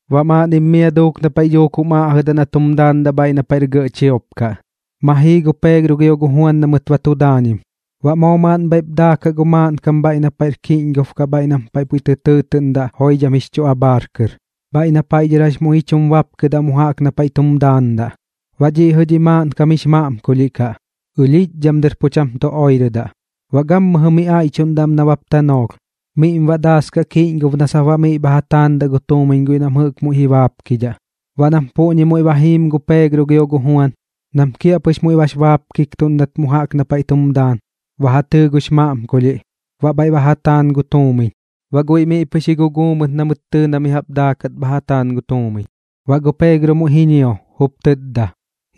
Baꞌ maaꞌnnim mia duuk na paiꞌ dhuuk jum aꞌjɨdaꞌ na tum daandaꞌ bhaiꞌ na paiꞌr gɇꞌ chiop kaꞌ, ma jii gu Peegro gio gu Juan na mɨt ba tu daañim. Baꞌ moo maaꞌn bhaiꞌp daakaꞌ gu maaꞌnkam bhaiꞌ na paiꞌr kiꞌñgob kaꞌ bhaiꞌ nam paiꞌ puiꞌ tɨ tɨɨtɨꞌndaꞌ: Joidham jix chu Abhaar Kɨr, bhaiꞌ na paiꞌ dhɨr jax muiꞌ ji chum bapkɨdaꞌ mu jaꞌk na paiꞌ tum daandaꞌ. Baꞌ dhiꞌ jɨꞌ dhi maaꞌnkam jix maꞌmkulhiꞌ kaꞌ, ɨlhiꞌchdham dɨr pu cham tu oirɨdaꞌ. Baꞌ gammɨjɨ miꞌ aiꞌchuꞌndaꞌ am nabap tanoolh, miꞌm baꞌ daaskaꞌ kiꞌñgob na sap baꞌ miꞌ bha ja taandaꞌ gu tuumiñ guiꞌ nam jɨꞌk muiꞌ ji baapkidhaꞌ. Baꞌ nam puꞌñi muiꞌ ba jiim gu Peegro gio gu Juan, nam kiaꞌpɨx muiꞌ bax baapkiktuꞌndat mu jaꞌk na paiꞌ tum daan, ba ja tɨɨ gux maꞌmkulhiꞌ, baꞌ bhaiꞌ ba ja taan gu tuumiñ. Baꞌ guiꞌ miꞌ pɨx ji guguu mɨt na mɨt tɨɨ na mi jaꞌp daakat bha ja taan gu tuumiñ. Baꞌ gu Peegro muiꞌ ji ñio, jup tɨtda: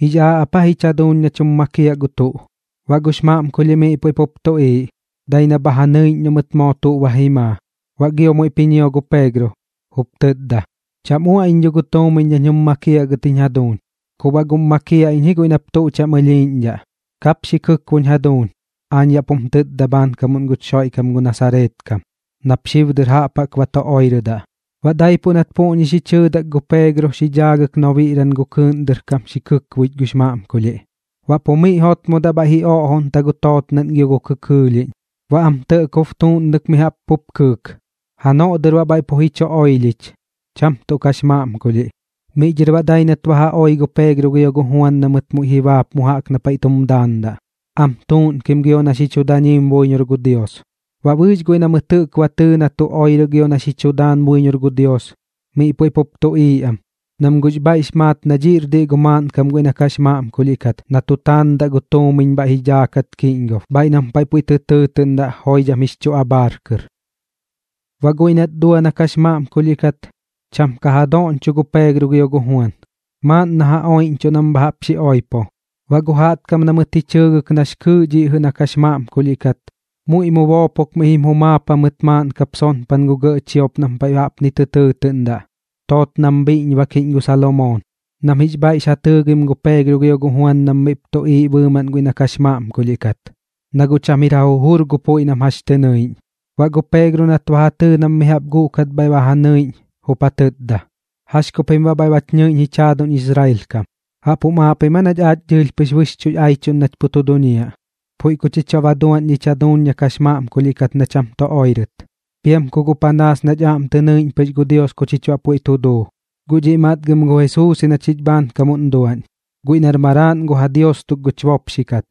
―¿Jix aaꞌ ap aa jich jaduuñ nach jum makiaꞌ gu tuꞌ? Baꞌ gux maꞌmkulhiꞌ miꞌ puiꞌ pup tuꞌiiꞌ, dai na bha ja nɨiꞌñ noꞌ mɨt moo tuꞌ ba ji maa. Baꞌ gio muiꞌp ji ñio gu Peegro, jup tɨtda: ―Cham uaꞌ iñ dho gu tuumiñ nañ jum makiaꞌ gɨt jiñ jaduuñ. Ku baꞌ guꞌm makiaꞌ iñ ji guiꞌ nap tuꞌ cham ɨlhiiꞌñdhaꞌ. Kap xi kɨkboꞌñ jaduuñ. Aañ yaꞌ pum tɨtda bhaankamuꞌn guch Xoiꞌkam gu Nasareet kam, nap xib dɨr jaꞌp jaꞌk ba tu oirɨdaꞌ. Baꞌ daipuꞌ nat puꞌñi xi chɨɨdak gu Peegro xi dhaagɨk nobiꞌran gu kɨɨꞌn dɨr kam xi kɨkbuich gux maꞌmkulhiꞌ. Baꞌ pu miꞌ jotmodaꞌ bhaiꞌ ji oꞌjoꞌta gu tootnaꞌn gio gu kɇkɇɇlhiꞌñ, baꞌ am tɇꞌkob tuuꞌnɨk mi jaꞌp pup kɨɨk. Janoꞌ dɨr baꞌ pu bhaiꞌ ji chu oilhich, cham tuꞌ kax maꞌmkulhiꞌ. Miꞌ dhɨr baꞌ dai nat ba ja oi gu Peegro gio gu Juan na mɨt muiꞌ ji baap mu jaꞌk na paiꞌ tum daandaꞌ, am tuuꞌnkim gio na xi chu daañim buiñor gu Dios. Baꞌ bɨɨx guiꞌ na mɨt jɨꞌk ba tɨɨ na tu oirɨ gio na xi chu daan buiñor gu Dios, miꞌ puiꞌ pup tuꞌiiꞌ am, nam guꞌx bhaiꞌx maat na dhiꞌr diꞌ gu maaꞌnkam guiꞌ na kax maꞌmkulhiꞌ kat na tu taandat gu tuumiñ bhaiꞌ ji dhaakat kiꞌñgob, bhaiꞌ nam paiꞌ puiꞌ tɨ tɨɨtɨꞌndaꞌ Joidham jix chu Abhaar Kɨr. Baꞌ guiꞌ nat dua na kax maꞌmkulhiꞌ kat, cham ka ja dadooꞌñcho gu Peegro gio gu Juan, maaꞌn na ja oiꞌñchuꞌ nam bha jaꞌp xi oipo. Baꞌ gu jaꞌtkam na mɨt ji chɨɨgɨk nax kɨɨꞌ dhiꞌ jɨꞌ na kax maꞌmkulhiꞌ kat, muiꞌ mu boopok miꞌ jim jumaap jamɨt maaꞌn kap sonpan gu gɇꞌ chiop nam paiꞌ jaꞌpni tɨ tɨɨtɨꞌndaꞌ: Tootnam Bhiꞌñbakiꞌñ gu Salomoon, nam jix bhaiꞌx ja tɨɨgim gu Peegro gio gu Juan nam miꞌp tuꞌiiꞌ bɨɨmaꞌn guiꞌ na kax maꞌmkulhiꞌ kat, na guꞌ cham jir ja jujur gu puiꞌ nam jax tɨ nɨiꞌñ. Baꞌ gu Peegro nat ba ja tɨɨ nam mi jaꞌp guꞌkat bhaiꞌ ba ja nɨiꞌñ, jup ja tɨtda: ―¿Jax ku pim baꞌ bhaiꞌ bach nɨiꞌñ jich jaaduñ Israel kam? ¿Jaꞌp jum aaꞌ pim aa nach aach dɨɨlh pɨx bɨxchuꞌx chu aiꞌchuꞌn nach pu tu duñiaꞌ, puiꞌ ku chich baꞌ duaꞌñ dhich jaduuñ na kax maꞌmkulhiꞌ kat na cham tu oirɨt, piam ku guꞌ panaas nach aꞌm tɨ nɨiꞌñ pɨx gu Dios na chich baꞌ puiꞌ tu duu? Guꞌ dhiꞌ matgɨm gu Jesuus ji na chich bhaankamuꞌn duaꞌñ, guiꞌ nar maraaꞌn gu ja Dios tuk guch bopxi kat,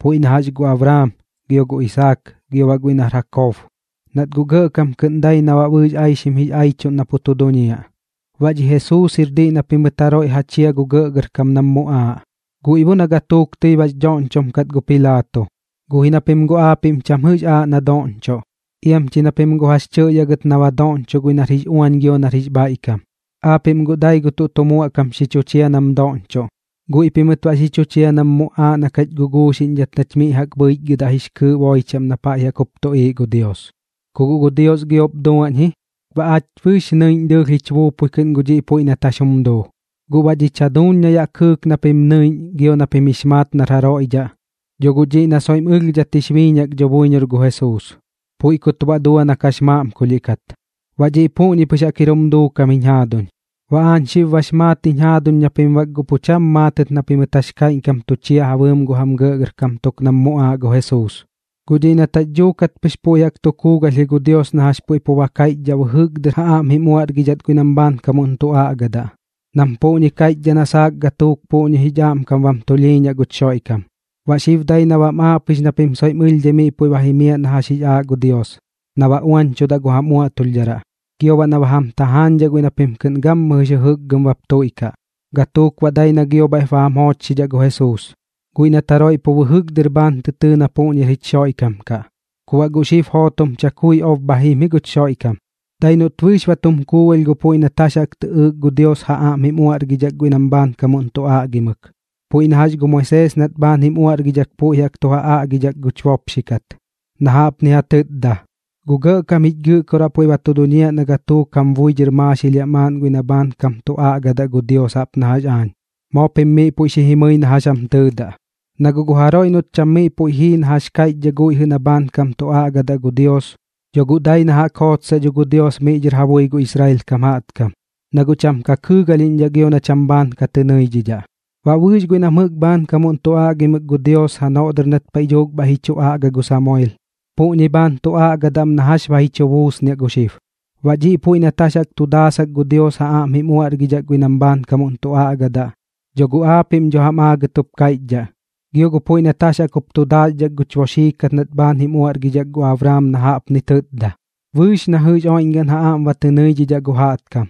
puiꞌ na jax gu Abraam, gio gu Isaak, gio baꞌ guiꞌ nar Jakob, nat guꞌ gɇꞌkam kɨꞌn dai na baꞌ bɨɨx aixim jix aiꞌchuꞌn na pu tu duñiaꞌ. Baꞌ dhi Jesuus jir diꞌ na pimɨt jaroiꞌ ja chia gu gɇꞌgɇrkam nam muꞌaaꞌ, guiꞌ bo na gatuuk tɨi bax dhoꞌñchom kat gu Pilaato, guꞌ ji na pim guꞌ aapiꞌm cham jɨꞌx aaꞌ na doꞌñchoꞌ. Iam chi na pim guꞌ jax chɨꞌyaꞌ gɨt na ba doꞌñchoꞌ guiꞌ nar jix uañ gio nar jix bhaiꞌkam. Aapiꞌm guꞌ dai gu tuꞌ tu muaꞌkam xi chu chia nam doꞌñchoꞌ. Guiꞌ pimɨt baꞌ xi chu chia nam muꞌaaꞌ na kach guguuxiꞌñdhat nach miꞌ jaꞌk bhɨichgɨdaꞌ jix kɨɨꞌ boi chaꞌm na paiꞌ jaꞌk jup tuꞌiiꞌ gu Dios. Ku guꞌ gu Dios giop duaꞌñ ji, baꞌ aach bɨɨx nɨiꞌñ dɨɨlh jich buupui kɨꞌn gu dhiꞌ puiꞌ nat jax jum duu. Guꞌ baꞌ dhich jaduuñ na yaꞌ kɨɨk na pim nɨiꞌñ gio na pim jix maat nar jaroiꞌ dhaꞌ, dho guꞌ dhiꞌ na soiꞌm ɨlhdhat jix biiñak dho buiñor gu Jesuus, puiꞌ kut baꞌ dua na kax maꞌmkulhiꞌ kat. Baꞌ dhiꞌ puꞌñi pɨx jaꞌk jir jum duukam jiñ jaaduñ. ’Baꞌ aañ xib bax maat jiñ jaaduñ na pim bak pu cham maatɨt na pimɨt jax kaiꞌñkam tu chia ja bɨɨm gu jam gɇꞌgɇrkam tuk nam muꞌaaꞌ gu Jesuus. Guꞌ dhiꞌ nat jax dhuukat pɨx puiꞌ jaꞌk ba tu kuugalh ji gu Dios na jax puiꞌ pu ba kaiꞌchdhaꞌ bɨjɨk dɨr ja aꞌm jim uaꞌrgidhat guiꞌ nam bhaankamuꞌn tu aꞌgadaꞌ, nam puꞌñi kaiꞌchdhaꞌ na saak gatuuk puꞌñi jich aꞌmkam bam tulhiiñaꞌ guch Xoiꞌkam. Baꞌ gu xib dai na bam aaꞌ pɨx na pim soiꞌm ɨlhdhai miꞌ puiꞌ ba jimiaꞌ na jax jix aaꞌ gu Dios na baꞌ ba uañchudaꞌ gu jam uaꞌtulhdharaꞌ, gio baꞌ na ba jam tajaañdhaꞌ guiꞌ na pim kɨꞌn gammɨjɨ jix jɨjɨkgɨm bap tuiꞌkaꞌ. Gatuuk baꞌ dai na gio bhaiꞌp ba jam joochxidhaꞌ gu Jesuus, guiꞌ nat jaroiꞌ pu bɨjɨk dɨr bhaan tɨ tɨɨ na puꞌñir jich Xoiꞌkam kaꞌ. Ku baꞌ guꞌ xib jootom chakui ob bha jim ji guch Xoiꞌkam, dai noꞌt bɨɨx ba tum kuugalh gu puiꞌ nat jax jaꞌk tɨꞌɨɨk gu Dios ja aꞌm jim uaꞌrgidhak guiꞌ nam bhaankam tu aꞌgimɨk. Puiꞌ na jax gu Moisees nat bhaan jim uaꞌrgidhak puiꞌ tu ja aꞌgidhak guch bopxi kat, na jaꞌpni ja tɨtda: “Gu Gɇꞌkam jich Gɨꞌkoraꞌ puiꞌ ba tu duñiaꞌ na gatuuk jam bui dhɨr maaxilhiaꞌ maaꞌn guiꞌ na bhaankam tu aꞌgadaꞌ gu Dios jaꞌp na jax aañ. Moo pim miꞌ puiꞌ xi jimɨi na jax jam tɨɨdaꞌ. Na guꞌ gu jaroiꞌ noꞌt cham miꞌ puiꞌ jii na jax kaiꞌchdhaꞌ guiꞌ jɨꞌ na bhaankam tu aꞌgaꞌ gu Dios, dho guꞌ dai na jaꞌk jootsaꞌ dho gu Dios miꞌ dhɨr ja bui gu Israel kam jaꞌtkam, na guꞌ cham ka kɨɨgalhiꞌñdhaꞌ gio na cham bhaan ka tɨ nɨidhidhaꞌ.” ’Baꞌ bɨɨx guiꞌ nam jɨꞌk bhaankam tu aꞌgimɨk gu Dios janoꞌ dɨr nat paiꞌ dhuuk bhaiꞌ ji chu aꞌga gu Samuel, puꞌñi bhaan tu aꞌgadaꞌ am na jax ba ji chu buusnichuꞌ gu xib. Baꞌ dhiꞌ puiꞌ nat jax jaꞌk tu daasak gu Dios ja aꞌm jim uaꞌrgidhat guiꞌ nam bhaankam tu aꞌgadaꞌ, dho guꞌ aapiꞌm dho jam aagɨt jup kaiꞌchdhaꞌ. Gio gu puiꞌ nat jax jaꞌk jup tu ja daaxdhak guch bopxi kat nat bhaan jim uaꞌrgidhak gu Abraam na baꞌ jaꞌpni ja tɨtda: “Bɨɨx na jɨꞌx oiꞌñgaꞌn ja aꞌm ba tɨ nɨidhidhaꞌ gu jaꞌtkam,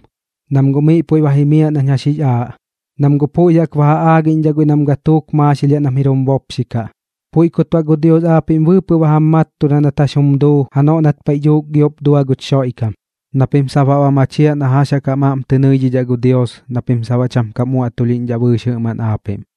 nam guꞌ miꞌ puiꞌ ba jimiaꞌ nañ jax jix aaꞌ, nam guꞌ puiꞌ jaꞌk ba ja aagiꞌñdhaꞌ guiꞌ nam gatuuk ka maaxilhiaꞌ nam jir jum bopxi kaꞌ.” Puiꞌ kut baꞌ gu Dios aapiꞌm bɨɨpɨꞌ ba jam mattuda nat jax jum duu janoꞌ nat paiꞌ dhuuk giop dua guch Xoiꞌkam, na pim sap baꞌ ba machiaꞌ na jax jaꞌk jam aꞌm tɨ nɨidhidhaꞌ gu Dios na pim sap baꞌ cham kam uaꞌtulhiꞌñdhaꞌ bɨɨx jɨꞌmaꞌn aapiꞌm.